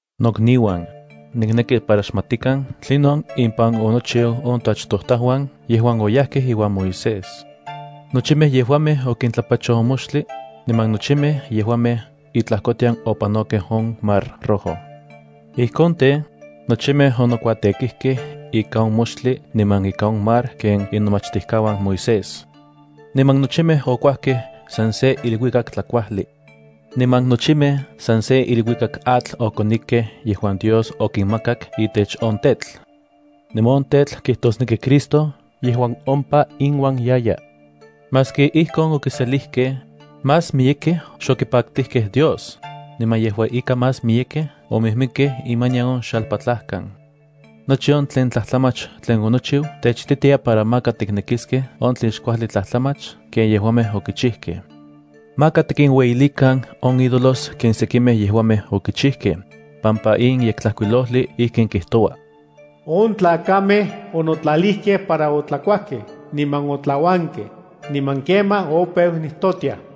Nokniuan, nikneki para xmatikan tlinon impan onochiu on toachtojtajuan yejuan oyajkej iuan Moisés. Nochimej yejuamej okintlapachoj on moxtli, niman nochimej yejuamej itlajkotian opanokej on Mar Rojo. Ijkon tej, nochimej onokuatekijkej ika on moxtli niman ika on mar ken inomachtijkauan Moisés. Niman nochimej okuajkej san se iluikak tlakuajli. Niman nochimej san se iluikak atl okonikej yejuan Dios okinmakak itech on tetl. Niman on tetl kijtosneki Cristo yejuan ompa inuan yaya. Maski ijkon okiselijkej, más miyekej xokipaktijkej Dios, niman yejua ika más miyekej omijmikkej imanian on xalpatlajkan. Nochi on tlen tlajtlamach tlen onochiu techititia para maka tiknekiskej on tlen xkuajli tlajtlamach ken yejuamej okichijkej. Maka tikinueyilikan on ídolos ken sekimej yejuamej okichijkej, pampa in Yektlajkuilojli ijkin kijtoua: “On tlakamej onotlalijkej para otlakuajkej niman otlauankej, niman kemaj opeu nijtotiaj.”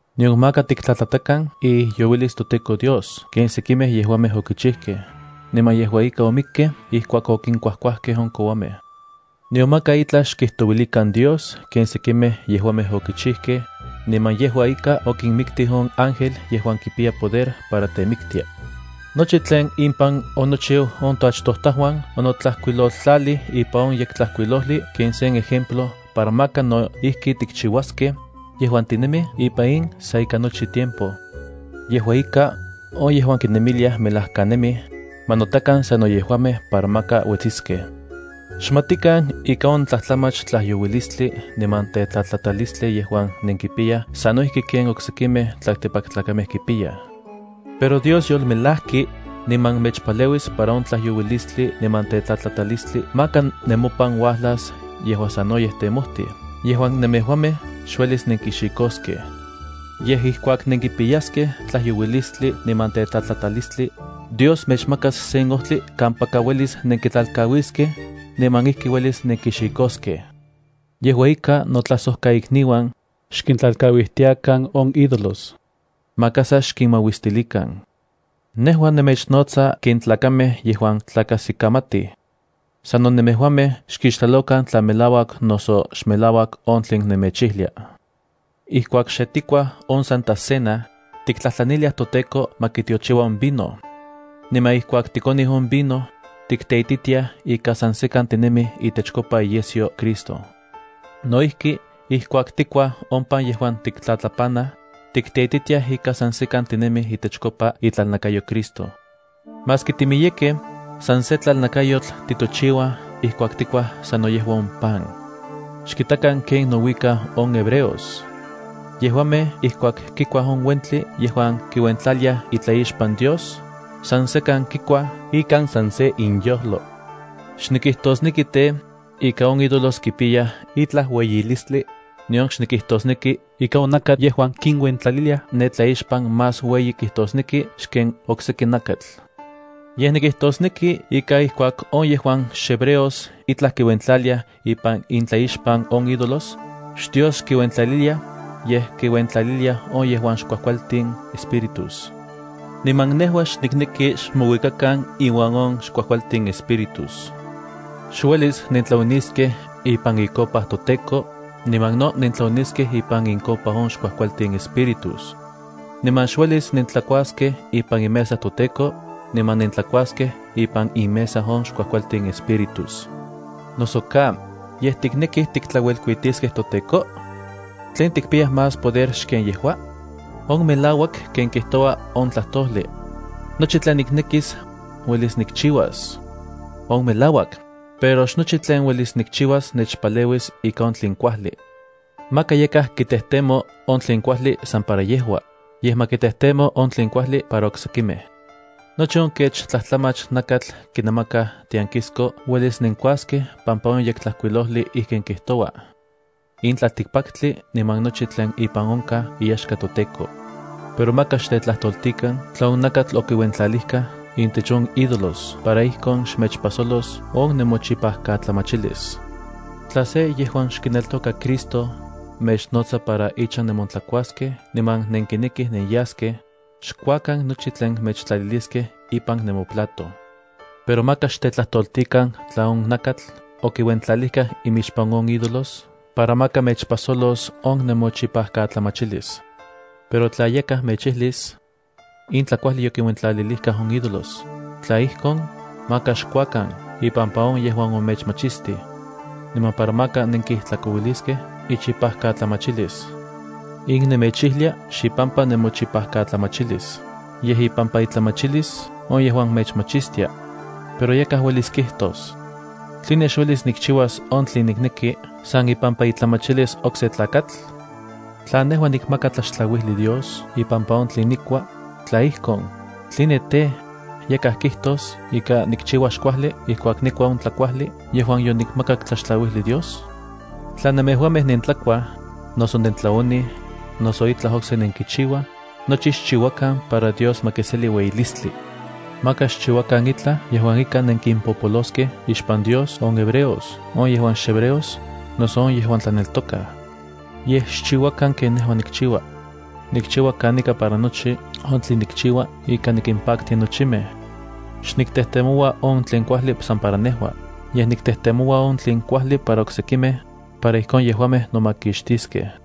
Nion maka tiktlatlatakan iijyouilis toTEKO Dios ken sekimej yejuamej okichijkej, niman yejua ika omikkej ijkuak okinkuajkuajkej on kouamej. Nion maka itlaj xkijtouilikan Dios ken sekimej yejuamej okichijkej, niman yejua ika okinmiktij on ángel yejuan kipiya poder para temiktia. Nochi tlen impan onochiu on toachtojtajuan onotlajkuiloltlalij ipan on Yektlajkuilojli ken sen ejemplo para maka no ijki tikchiuaskej, yejuan tinemij ipan in sa ika nochi tiempo. Yejua ika, on yejuan kinemiliaj melajkanemij, ma notakan sano yejuamej para maka uetsiskej. Xmatikan ika on tlatlamach tlayouilistli niman tetlatlatalistli yejuan nenkipiyaj sano ijki ken oksekimej tlaltikpaktlakamej kipiyaj. Pero Dios yolmelajki, niman mechpaleuis para on tlayouilistli niman tetlatlatalistli maka nemopan uajlas yejuan sanoyej temojtij yejuan nemejuamej xuelis nenkixikoskej. Yej ijkuak nenkipiyaskej tlayouilistli niman tetlatlatalistli, Dios mechmakas sen ojtli kampaka uelis nenkitlalkauiskej, niman ijki uelis nenkixikoskej. Yejua ika notlajsojkaikniuan, xkintlalkauijtiakan on ídolos. Maka sa xkinmauistilikan. Nejua nemechnotsa ken tlakamej yejuan tlakajsikamatij. Sano nemejuamej xkixtlalokan tla melauak noso xmelauak on tlen nemechijlia. Ijkuak xe tikuaj on Santa Cena, tiktlajtlaniliaj toTEKO ma kitiochiua on vino. Niman ijkuak tikonij on vino, tikteititiaj ika san sekan tinemij itechkopa iyesyo Cristo. No ijki ijkuak tikuaj on pan yejuan tiktlatlapanaj, tikteititiaj ika san sekan tinemij itechkopa itlalnakayo Cristo. Maski timiyekej, san se tlalnakayotl titochiuaj ijkuak tikuaj sanno yejua on pan. Xkitakan ken nouikaj on hebreos. Yejuamej ijkuak kikuaj on uentli yejuan kiuentlaliaj itlaixpan Dios, san sekan kikuaj ika san se inyojlo. Xnikijtosneki tej, ika on ídolos kipiyaj itlaj ueyilistli, nion xnikijtosneki ika on nakatl yejuan kiuentlaliliaj ne tlaixpan más ueyi kijtosneki xken okseki nakatl. Yej nikijtosneki ika ijkuak on yejuan xhebreos itlaj kiuentlaliaj ipan intlaixpan on ídolos, xDios kiuentlaliliaj, yej kinuentlaliliaj on yejuan xkuajkualtin espíritus. Niman nejua xnikneki xmouikakan inuan on xkuajkualtin espíritus. Xuelis nentlaoniskej ipan icopa toTEKO, niman no nentlaoniskej ipan incopa on xkuajkualtin espíritus. Niman xuelis nentlakuaskej ipan imesa toTEKO, niman nentlakuaskej ipan inmesa on xkuajkualtin espíritus. Noso ka, ¿yej tiknekij tiktlauelkuitiskej toTEKO? ¿Tlen tikpiyaj más poder xken yejua? On melauak ken kijtoua on tlajtojli: “Nochi tlen niknekis, uelis nikchiuas.” On melauak, pero xnochi tlen uelis nikchiuas nechpaleuis ika on tlen kuajli. Maka yakaj kitejtemo on tlen kuajli san para yejua, yej ma kitejtemo on tlen kuajli para oksekimej. Nochi on kech tlajtlamach nakatl kinamakaj tiankisko uelis nenkuaskej pampa in Yektlajkuilojli ijkin kijtoua: “In tlaltikpaktli niman nochi tlen ipan onkaj iyaxka toTEKO.” Pero maka xtetlajtoltikan tla on nakatl okiuentlalijkaj intech on ídolos para ijkon xmechpajsolos on nemochipajkatlamachilis. Tla se yejuan xkineltoka Cristo mechnotsa para ichan nemontlakuaskej niman nenkinekij nenyaskej, xkuakan nochi tlen mechtlaliliskej ipan nemoplato. Pero maka xtetlajtoltikan tla on nakatl okiuentlalijkaj ixpan on ídolos para maka mechpajsolos on nemochipajkatlamachilis. Pero tla yakaj mechijlis: “In tlakuajli yokinuentlalilijkaj on ídolos”, tla ijkon, maka xkuakan ipampa on yejuan omechmachistij, niman para maka nenkijtlakouiliskej ichipajkatlamachilis. In nemechijlia xipampa nemochipakatlamachilis, yej ipampa itlamachilis on yejuan mechmachistia. Pero yakaj uelis kijtos: “¿Tline xuelis nikchiuas on tlen nikneki san ipampa itlamachilis okse tlakatl? Tla nejua nikmaka tlaxtlauijli Dios ipampa on tlen nikua, tla ijkon, ¿tline tej, yakaj kijtos ika nikchiua xkuajli ijkuak nikua on tlakuajli yejuan yonikmakak tlaxtlauijli Dios?” Tla nemejuamej nentlakuaj, noso nentlaonij, noso itlaj okse nenkichiuaj, nochi xchiuakan para Dios ma kiseli ueyilistli. Maka xchiuakan itlaj yejuan ika nenkimpopoloskej ixpan Dios on hebreos, on yejuan xhebreos noso on yejuan tlaneltokaj. Yej xchiuakan ken nejua nikchiua. Nikchiua kanika para nochi on tlen nikchiua ika nikimpaktia nochimej. Xniktejtemoua on tlen kuajli san para nejua, yej niktejtemoua on tlen kuajli para oksekimej, para ijkon yejuamej nomakixtiskej.